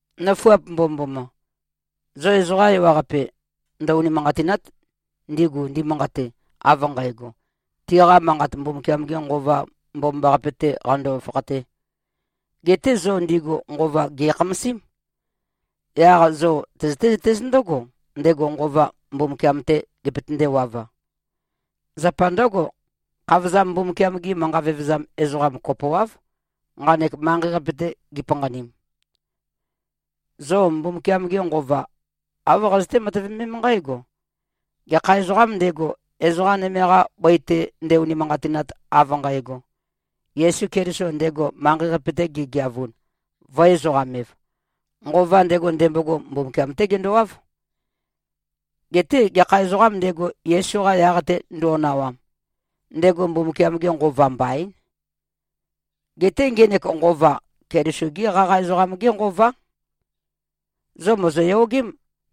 Nøfuap mbomømboma! Zo ezoqa ewaqape ndø-unimanqatìna᷄t, ndigu ndimanqate, av nqægo, tiqa manqat Mbumbukiam-gē Nqova Mbomambaqape-tē qando-fakhatē. Geté zo ndigu nqova, gè꞉khamasím. Yaq zo tøzøté-zøtéz ndǿgo, ndego nqova, Mbumbukiam-tē gepøtendēwav-a. Zapa ndǿgo, khavozam Mbumbukiam-gi manqa vevezam ezoqam kopoáv, nqanek manqei-qape-te gipanqanim. Zo Mbumbukiam-ge Nqova, āv qazøté-matøvemém nqǽgo: Gekha ezoqām ndego, ezoqa nøme-qa bøi-te nde-unimanqatinat, av nqægo, Yesu Keliso ndego manqei-qape-te gegeavun, vø̄-ezoqam-ev, nqova ndego, ndembogo, Mbumbukiam-té gendowáv. Geté gekha ezoqām ndego, Yesu-qa yaq-te ndo꞉nawam, ndego Mbumbukiam-ge Nqova mbaín. Geté ngenek nqova, Keliso-gé qaqa ezoqam-gé nqová. Zo mòzoyogém,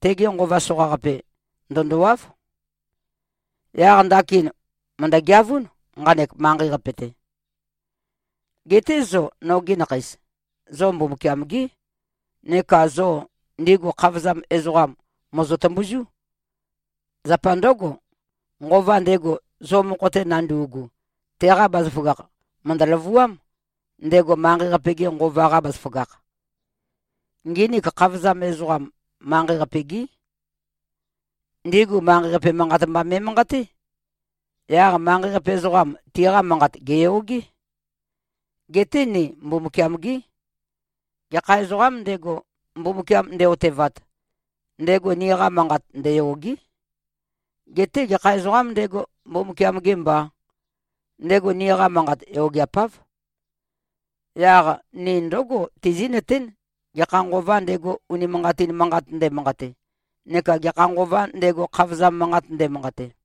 tege nqova soqaqape, ndø̀ndowáv. Yaq ndakin mø̀ndø-geavún, nqanek manqei-qape-te. Geté zo, nogi nakheis, zo Mbumbukiam-gí. Neka zo ndigu khavozam ezoqam, mòzo-tømbuzú. Zapa ndǿgo, nqova ndego, zo mokho-te nandu꞉gu, teqa bazaføgakh mø̀ndø-løvuám, ndego manqei-qape-ge nqova-qa bazaføgakh. Nginik khavozam ezoqam, manqei-qape-gí. Ndigu manqei-qape manqat mba me꞉manqaté. Yaq manqei-qape ezoqam, tiqa manqat, gèyogé. Geté ni Mbumbukiam-gí. Gekha ezoqām ndego, Mbumbukiam nde꞉-otevat, ndego niqa manqat ndeyôgé. Geté gekha ezoqām ndego, Mbumbukiam-gē mbā, ndego niqa manqat yogeapáv. Yaq ni ndǿgo, tizí꞉nøtén, gekha nqovā ndego, unimanqatin manqat ndemanqate, neka gekha nqovā ndego, khavozam manqat ndēmānqātē.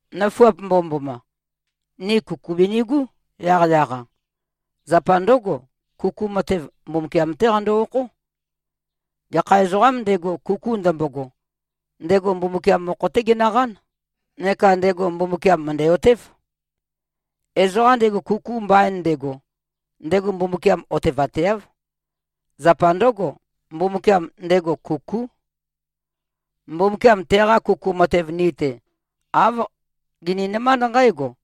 Nøfuap mbomømboma. Ni kuku binigú, yaqyaq-a. Zapa ndǿgo, kuku matev, Mbumbukiam-té qando-okhó. Gekha ezoqām ndego, kuku ndømbogo, ndego Mbumbukiam mokho-té genøqán, neka ndego Mbumbukiam mø̀ndæ-otév. Ezoqa ndego kuku mbain ndego, ndego Mbumbukiam otevateáv. Zapa ndǿgo, Mbumbukiam, ndego kukú. Mbumbukiam teqa kuku matev ni-te, āv gininømánd nqǽgo: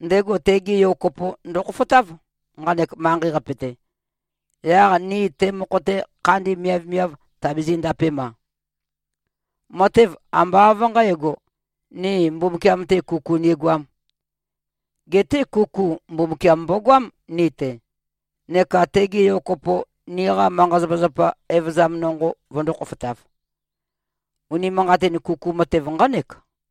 Ndego tege Yo kopo ndokhofotáv, nqanek manqei-qape-te, yaq ni te mokho-te khandi miavmiav tabizī꞉-ndapem-a. Matev ambá av nqǣgo, ni Mbumbukiam-te kuku nigoām. Geté kuku, Mbumbukiam mbogoám, ni-te, neka tege Yo kopo niqa manqa-zapazapa evøzam nonqo vøndō-khofotav. Unimanqatin kuku matev nqánek.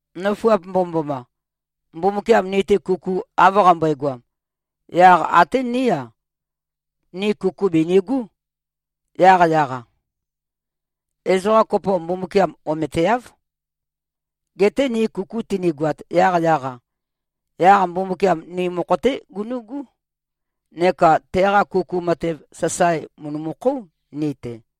Nøfuap mbomømboma! Mbumbukiam ni-te kuku av qambøegoam, yaq até ní-a, ni kuku binigú, yaqyaq-a. Ezoqa kopo, Mbumbukiam ometeáv. Geté ni kuku tønigoat, yaqyaq-a, yaq Mbumbukiam ni mokho-té gunu꞉gú neka teqa kuku matev, sasae mø̀ndømukhóu, ni-te.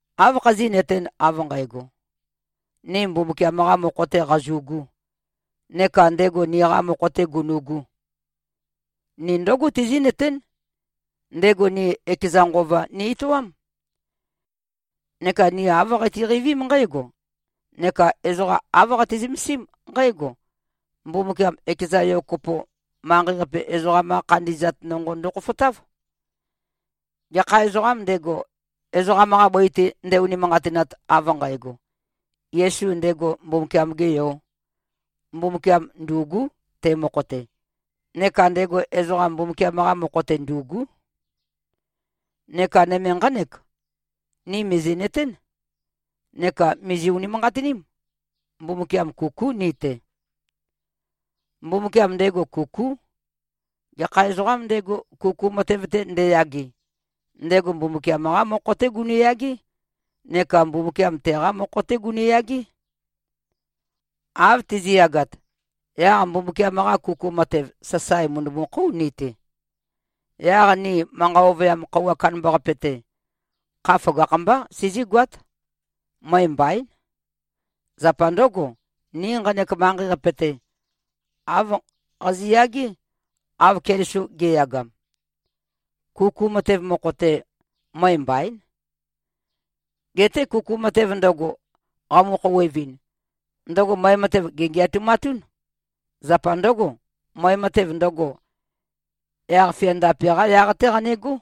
Áv khazí꞉nøtēn, av nqægo, ni Mbumbukiam-qā mokho-tē qazu꞉gū, neka ndego niqā mokho-tē gunu꞉gū? Ni ndǿgo tizí꞉nøtén: Ndego ni ekeza Nqova ni-etoám. Neka ni āv qatiqeivím nqǽgo neka ezoqa āv qati-zømesím nqǽgo: Mbumbukiam ekeza Yo kopo, manqei-qape ezoqam-qa khandi꞉zat nonqo ndokhofotáv. Gekha ezoqām ndego, ezoqam-qa bøi-te nde-unimanqatinat, av nqægo, “Yesu ndego Mbumbukiam-gē Yō,” Mbumbukiam ndû꞉gú, te mokho-te, neka ndego ezoqam, Mbumbukiam-qa mokho-te ndû꞉gú. Neka nøme nqánek: Ni mìzi꞉nøtén neka mìzi-unimanqatiním. Mbumbukiam, kukú ni-te. Mbumbukiam, ndego kukú. Gekha ezoqām ndego, kuku matev-te ndeyage, ndego Mbumbukiam-qá mokho-té gunu꞉yagé neka Mbumbukiam teqá mokho-té gunu꞉yagé. Av tizi꞉yagat, yaq Mbumbukiam-qa kuku matev, sasae mø̀ndømukhóu ni-te. Yaq ni manqa ovøyam khøuwa kandambaqape-te, kha føgakh-mbá sizígoát. Møe mbaín. Zapa ndǿgo, ni nqanek manqei-qape-te, āv qazi꞉yagé, av Keliso ge꞉yagam. Kuku matev mokho-te, møe mbaín. Geté kuku matev ndøgo, qamu-khouwevɨn, ndøgo møe matev, gèngeatumatún. Zapa ndǿgo, møe matev ndøgo, yaq-fia ndape-qá yaq-té qanegó.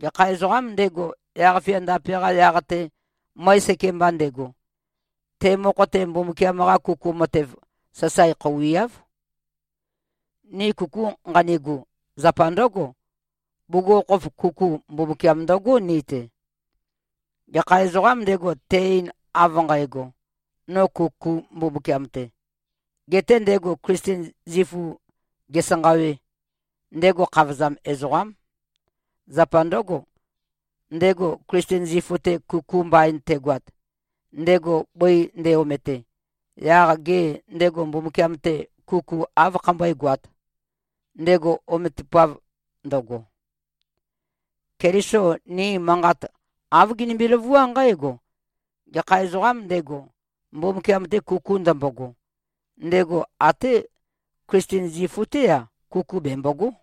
Gekha ezoqām ndego, yaq-fia ndape-qa yaq-te møe sekemba ndego, te mokho-te, Mbumbukiam-qa kuku matev, sasae khouiáv. Ni kuku nqanigu, zapa ndǿgo. Bugukhokhof kuku, Mbumbukiam ndøgó, ni-te. Gekha ezoqām ndego, te-ein, av nqægo, “No kukū Mbumbukiam-te”, getē ndego Klisten zifu gesanqâwē, ndego khavozam ezoqám. Zapa ndǿgo, ndego Klisten zifu-te kuku mbain tegoat, ndego bøi nde-omete, yaq gê, ndego Mbumbukiam-te, kuku áv khambøégoāt, ndego ometupav ndøgo? Keliso ni manqat, āv ginimbi-løvuá nqǽgo: Gekha ezoqām ndego, Mbumbukiam-te kuku ndømbogo, ndego até Klisten zifu-té-a, kuku bembogó.